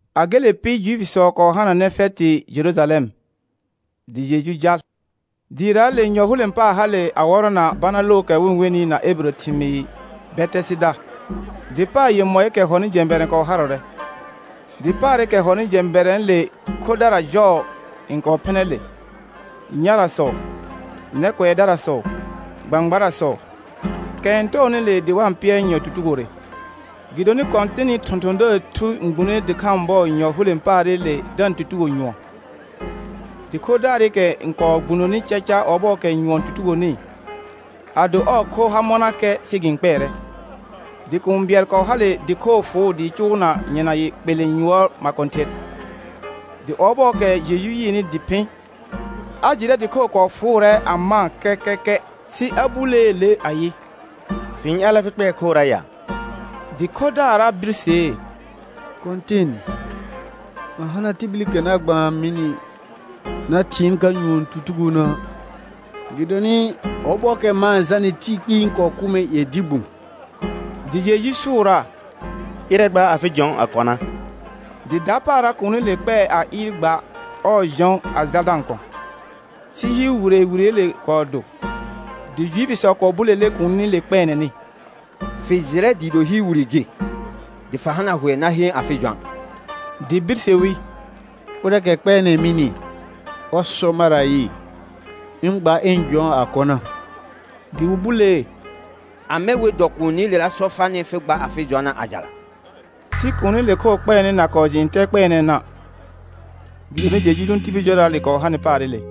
A gele pɩ Juifisɔ kɔɔ hananɛ fɛtɩ Jerujalɛm, dɩ Jeju jal. Dɩɩraale yɔ hulẽ paar hale a wɔrɔna Bana lookɛ wɩ-n wenɩ na ebirə thɩmɩɩr Bɛtɛsɩda, dɩ paar yemɔɩɩkɛ hɔnɩ jɛ̃bɛrɛ̃ kɔɔ harɔrɛ. Dɩ paarɩkɛ hɔnɩ jɛ̃bɛrɛ̃ɛle khodara jɔɔ n kɔɔ phɩnɛ le, yarasɔ, nɛ kʋɛdarasɔ, gbãgbarasɔ, [kɛ n tɔɔnɩ le dɩ wa-n pɩɛr yɔ tutugore, gɩdonɩ Kɔ̃tɩnɩ thɔ̃thɔ̃daar thu n gbune dɩkhãa bɔɔ yɔ hulẽ paarɩle da-n tutugo nyʋɔn. Dɩ khodaarɩkɛ n kɔɔ gbunoni caca ɔbɔɔkɛ nyʋɔn n tutugoni, ado ɔɔ kho ha mɔnakɛ sɩ gɩ-n kpɛɛrɛ.] Dɩ kũu bɩɛl kɔɔ hale dɩ khoo fʋʋ dɩ cʋʋna yɛna kpelẽ yʋɔr makõther. Dɩ ɔbɔɔkɛ Jeju yɩɩnɩ dɩ phɩ̃, a jɩrɛ dɩ khoo kɔɔ fʋʋrɛ a maan kɛkɛkɛ, sɩ a buleele ayɩ: Fɩ-n ƴaalɛ fɩ kpɛɛ khoora ya? Dɩ khodaarra birsee: Kɔ̃tɩn, ma hana tibilikɛ na gbaan mɩnɩ na thɩɩn ka nyʋɔn n tutugonə', gɩdonɩ ɔbɔɔkɛ ma-n jalnɩ tɩɩ kpɩɩ n kɔɔ kʋʋl mɛr ƴɩɛ dɩ gbũ. Dɩ Jeju sʋʋraa: Ɩrɛ gba afɩ jɔ̃ a kɔna. Dɩ dapaara kuunile kpɛɛ a ɩɩr gba ɔɔ jɔ̃ a jal da-n kɔ̃. Sɩ hɩɩr wire wireele kɔɔ do. Dɩ Juifisɔ kɔɔ bulele kuunile kpɛɛnɛnɩ: Fɩ jɩrɛ dɩɩ do hɩɩr wire gɩ, dɩ fa hana hʋɛ na heen afɩ jɔ̃a'. Dɩ birse wi: Ʋrɛɛkɛ kpɛɛnɛ mɩnɩ ɔr sɔ mar ayɩ, ɩ̃ gba ɩ̃ jɔ̃ a kɔna. Dɩ wɩ bulee: Amɛ wer dɔ kuunilera sɔ farnɩ fɩ gba afɩ jɔna a jala? Sɩ kuunile khoo kpɛɛnɩ na kɔɔ jɩ ntɛ kpɛɛnɛɛna', gɩdonɩ Jeju lʋʋn tibil jɔraale kɔɔ hanɩ paarɩle.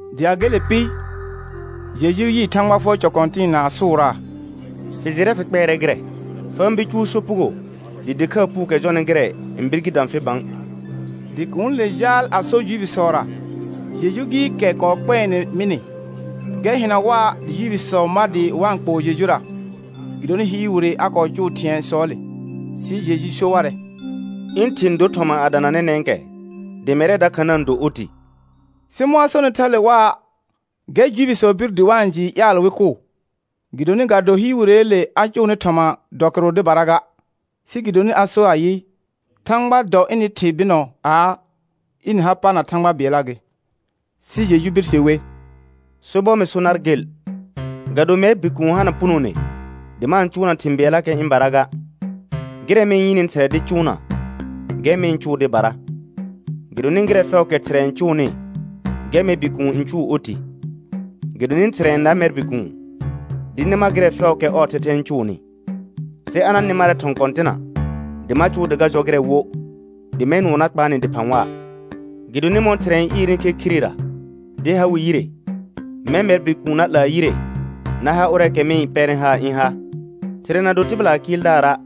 Dɩ a gele pɩ, Jeju yɩɩ Thãgba fʋɔr cɔ kɔ̃tɩɩna a sʋʋraa: Fɩ jɩrɛ fɩ kpɛɛrɛ gɩrɛ. Fa-n bir cʋʋ sopugo dɩ dɩkhaa puukɛ jɔnɩ gɩrɛ n bir gɩ dã fɩ bã. Dɩ kuunile jaal a so Juifisɔra: Jeju gɩɩkɛ kɔɔ kpɛɛnɛ mɩnɩ. Gɛr hɩna waa dɩ Juifisɔ ma dɩ wa-n kpoo Jejura, gɩdonɩ hɩɩr wire a kɔɔ cʋʋ thɩ̃ɛsɔɔle. Sɩ Jeju so warɛ: Ɩ̃ Thɩ n dor thɔma a dana nɛnɛ̃kɛ, dɩ mɛrɛ dakha na-n do oti. Sɩ mɔ̃ a sonɩ thale waa, gɛr Juifisɔ bir dɩ wa-n jɩɩ ƴaal wɩ kʋʋ, gɩdonɩ ga do hɩɩr wireele a cʋʋnɩ thɔma dɔ kɩrʋ dɩbara ga, sɩ gɩdonɩ a sor ayɩ, Thãgba dɔ ɩnɩ Thɩ bɩnɔ aa, ɩnɩ ha pa na Thãgba bɩɛlla gɩ. Sɩ Jeju birse wer: Sobɔr mɩ so nar gel, ga do mɛr Bikuun hana punone dɩ ma-n cʋʋna thɩ̃ bɩɛllakɛ ɩ̃bara ga. Gɩrɛ mɩ-n yɩnɩ Thɩrɛ dɩ cʋʋna, gɛr mɩ-n cʋʋ dɩbara. Gɩdonɩ gɩrɛ fɛʋʋkɛ Thɩrɛ n cʋʋnɩ, gɛr mɛr Bikuun n cʋʋ oti. Gɩdonɩ Thɩrɛ n nar mɛr Bikuun dɩ nɩ mar gɩrɛ fɛʋʋkɛ ɔr thɛthɛ n cʋʋnɩ. Sɩ a na nɩ marɛ thɔ̃ kɔ̃tɩna dɩ ma cʋʋ dɩ ga jɔ gɩrɛ wo, dɩ mɛ̃ nʋɔ na kpaa nɩ dɩphã waa. Gɩdonɩ mɔ̃ Thɩrɛ n ɩɩrnɩ khe khirera dɩ ha wɩ yire, mɛ̃ mɛr Bikuun na 'laa yire na ha ʋrɛɛkɛ mɩ-n pɛrnɩ haar ɩ̃ ha. Thɩrɛ na do tɩbɩlaa Kɩɩldaara',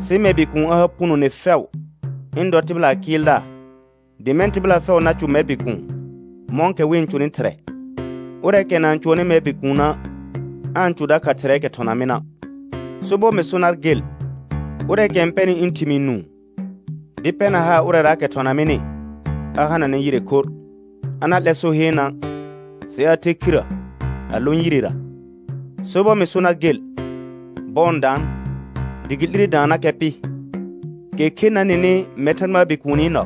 sɩ mɛr Bikuun a ha punone fɛʋ ɩ̃ dɔ tɩbɩlaa Kɩɩldaar, dɩ mɛ̃ tɩbɩla fɛʋ na cʋ mɛr Bikuun, mɔ̃kɛ wɩ-n cʋnɩ Thɩrɛ. Ʋrɛɛkɛ na-n cʋɔnnɩ mɛr Bikuuna', aa-n cʋ dakha Thɩrɛɛkɛ thɔna mɩna'. Sobɔr mɩ so nar gel, ʋrɛɛkɛ n pɛnɩ ɩ̃ thɩmɩɩ nũu dɩ pɛrna haar ʋrɛraakɛ thɔna mɩnɩ, a hananɛ yire khorr. A na 'lɛ so heena', sɩ a ther khirrə a lõ yirera. Sobɔr mɩ so nar gel, bɔɔ n daan dɩ gɩ 'lire daannakɛ pɩ, kɛ khe na nɩnɩ mɛr Thãgbaa Bikuuni nɔ,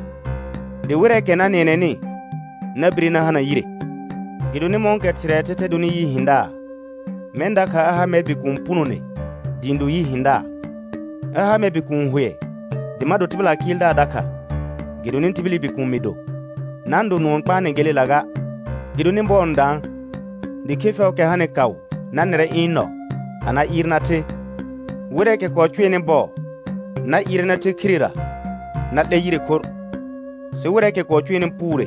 dɩ wɩrɛɛkɛ na nɩɛnɛnɩ na bire na hana yire. Gɩdonɩ mɔ̃kɛ Thɩrɛɛ thɛthɛ donɩ Yi hɩ̃daar, mɛ̃ dakha a ha mɛr Bikuun punone dɩ ɩ̃ do Yi hɩ̃daar. A har mɛr Bikuun hʋɛ dɩ ma do tɩbɩlaa Kɩɩldaar dakha, gɩdonɩ tibili Bikuun mɩ do. Na-n do nʋɔ n kpaa nɩ gelela ga, gɩdonɩ bɔɔ n daan dɩ khe fɛʋʋkɛ hanɩ kaʋ na nɩrɛ ɩ̃ nɔ a na ɩɩr na the. Wɩrɛɛkɛ kɔɔ cʋɛnɩ bɔɔ na ɩɩrɛ na the khirera na 'lɛ yire khorr, sɩ wɩrɛɛkɛ kɔɔ cʋɛnɩ puure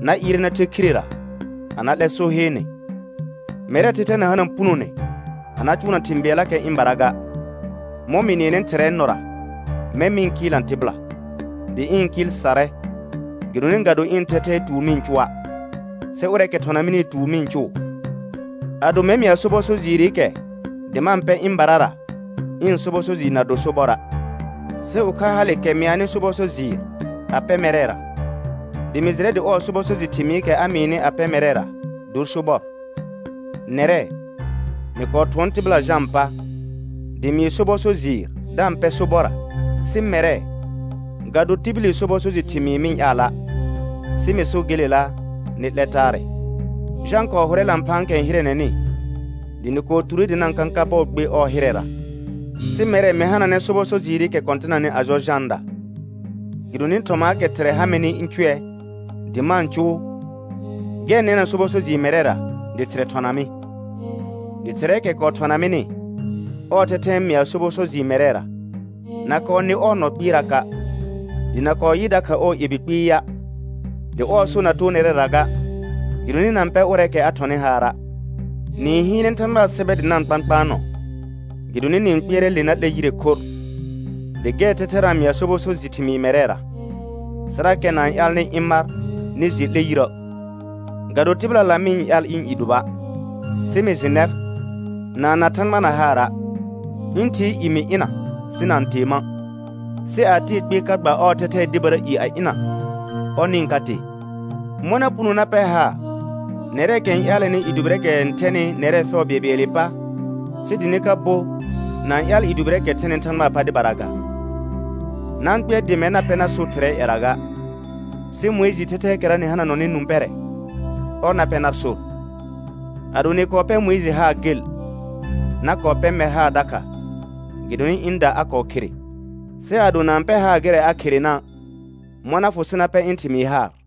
na ɩɩrɛ na the khirera a na 'lɛ so heene. Mɛrɛɛ thɛthɛ na hana punone a na cʋʋna thɩ̃ bɩɛllakɛ ɩ̃bara ga. Mɔ̃ mɩ nɩɛnɩ Thɩrɛɛ nɔra, mɛ̃ mɩ-n kɩɩlna tɩbɩla, dɩ ɩ̃ kɩɩl sarrɛ gɩdonɩ ga do ɩ̃ thɛthɛɛ tuur mɩ-n cʋa', sɩ ʋrɛɛkɛ thɔna mɩnɩɩ tuur mɩ-n cʋʋ. Ado mɛr mɩa sobɔ so jɩɩrɩkɛ dɩ ma-n pɛ ɩ̃barara, ɩ̃ sobɔ so jɩ na do sobɔra'. Sɩ ʋkha hale kɛ mɩanɩ sobɔ so jɩɩr a pɛ mɛrɛra, dɩ mɩ jɩrɛ dɩ ɔɔ sobɔ so jɩ thɩmɩɩkɛ a mɩɩnɩ a pɛ mɛrɛra dor sobɔr. Nɛrɛ, nɩ kɔɔ thʋɔn tɩbɩla Jãa pa dɩ mɩɩ sobɔ so jɩɩr da-n pɛ sobɔrra. Sɩ mɛrɛ, ga do tibili sobɔ so jɩ thɩmɩɩ mɩ-n ƴaala', sɩ mɩ sor gelela nɩ 'lɛ taarɛ. Jã kɔɔ hʋrɛ lãphãakɛ n hɩrɛnɛnɩ, dɩ nɩ kɔɔ ture dɩ na-n kãka bɔɔ gbe ɔɔ hɩrɛra. Sɩ mɛrɛ mɩ hananɛ sobɔ so jɩɩrɩkɛ kɔ̃tɩnanɩ a jɔ Jãada, gɩdonɩ thɔmaakɛ Thɩrɛ ha mɩnɩ ɩ̃ cʋɛ dɩ ma-n cʋʋ, gɛr n nɛna sobɔ so jɩɩr mɛrɛra dɩ Thɩrɛ thɔna mɩ. Dɩ Thɩrɛɛkɛ kɔɔ thɔna mɩnɩ,.ɔɔ thɛthɛ n mɩa sobɔ so jɩɩr mɛrɛra. Na kɔɔ nɩ ɔɔ nɔ kpɩɩraka', dɩ na kɔɔ yɩ dakha ɔɔ ƴɛbi kpɩɩa'. Dɩ ɔɔ so na too nɛrɛra ga, gɩdonɩ na-n pɛ ʋrɛɛkɛ a thɔnɩ haara'. Nɩ-n hɩɩnɛ Thãgbaa sɛbɛ dɩ na-n kpãkpaanɔ, gɩdonɩ nɩ-n kpɩɛrɛ le na 'lɛ yire khorr, dɩ gɛr thɛthɛra n mɩa sobɔ so jɩ thɩmɩɩr mɛrɛra. Sɩrakɛ na-n ƴaal nɩ ɩ̃ mar nɩ jɩɩ 'lɛ yirə'. Ga do tɩbɩlala mɩ-n ƴaal ɩ̃ i dʋba'. Sɩ mɩ jɩ nɛr: Na-n na Thãgba na haara'. Ɩ̃ Thɩɩ i mɩ ɩna sɩ na-n tee ma', sɩ a tɩɩ kpɩɩ ka gba ɔɔ thɛthɛɛ dɩbara i a ɩna, ɔr nɩ-n ka tee. Mɔ̃ na puno na pɛr haar nɛrɛɛkɛ n ƴaalɛnɩ i dʋbɩrɛɛkɛ n thɛnɩ nɛrɛ fɛʋ bɩɛlbɩɛlɩ pa, sɩ dɩ nɩ ka bo na-n ƴaal i dʋbɩrɛɛkɛ thɛnɩ Thãgbaa pa dɩbara ga. Na-n kpɩɛr dɩ mɛr na pɛ nar sor Thɩrɛɛ ƴɛra ga. Sɩ Mʋɩjɩɩ thɛthɛɛkɛra nɩ hananɔnɩ nũ pɛrɛ, ɔr na pɛ nar sor. Ado nɩ kɔɔ pɛr Mʋɩjɩ haar gel, na kɔɔ pɛ mɛr haar dakha gɩdonɩ ɩ̃da a kɔɔ khere. Sɩ ado na-n pɛr haar gɩrɛ a kherena', mɔ̃ na fʋ sɩ na pɛr ɩ thɩmɩɩ haar?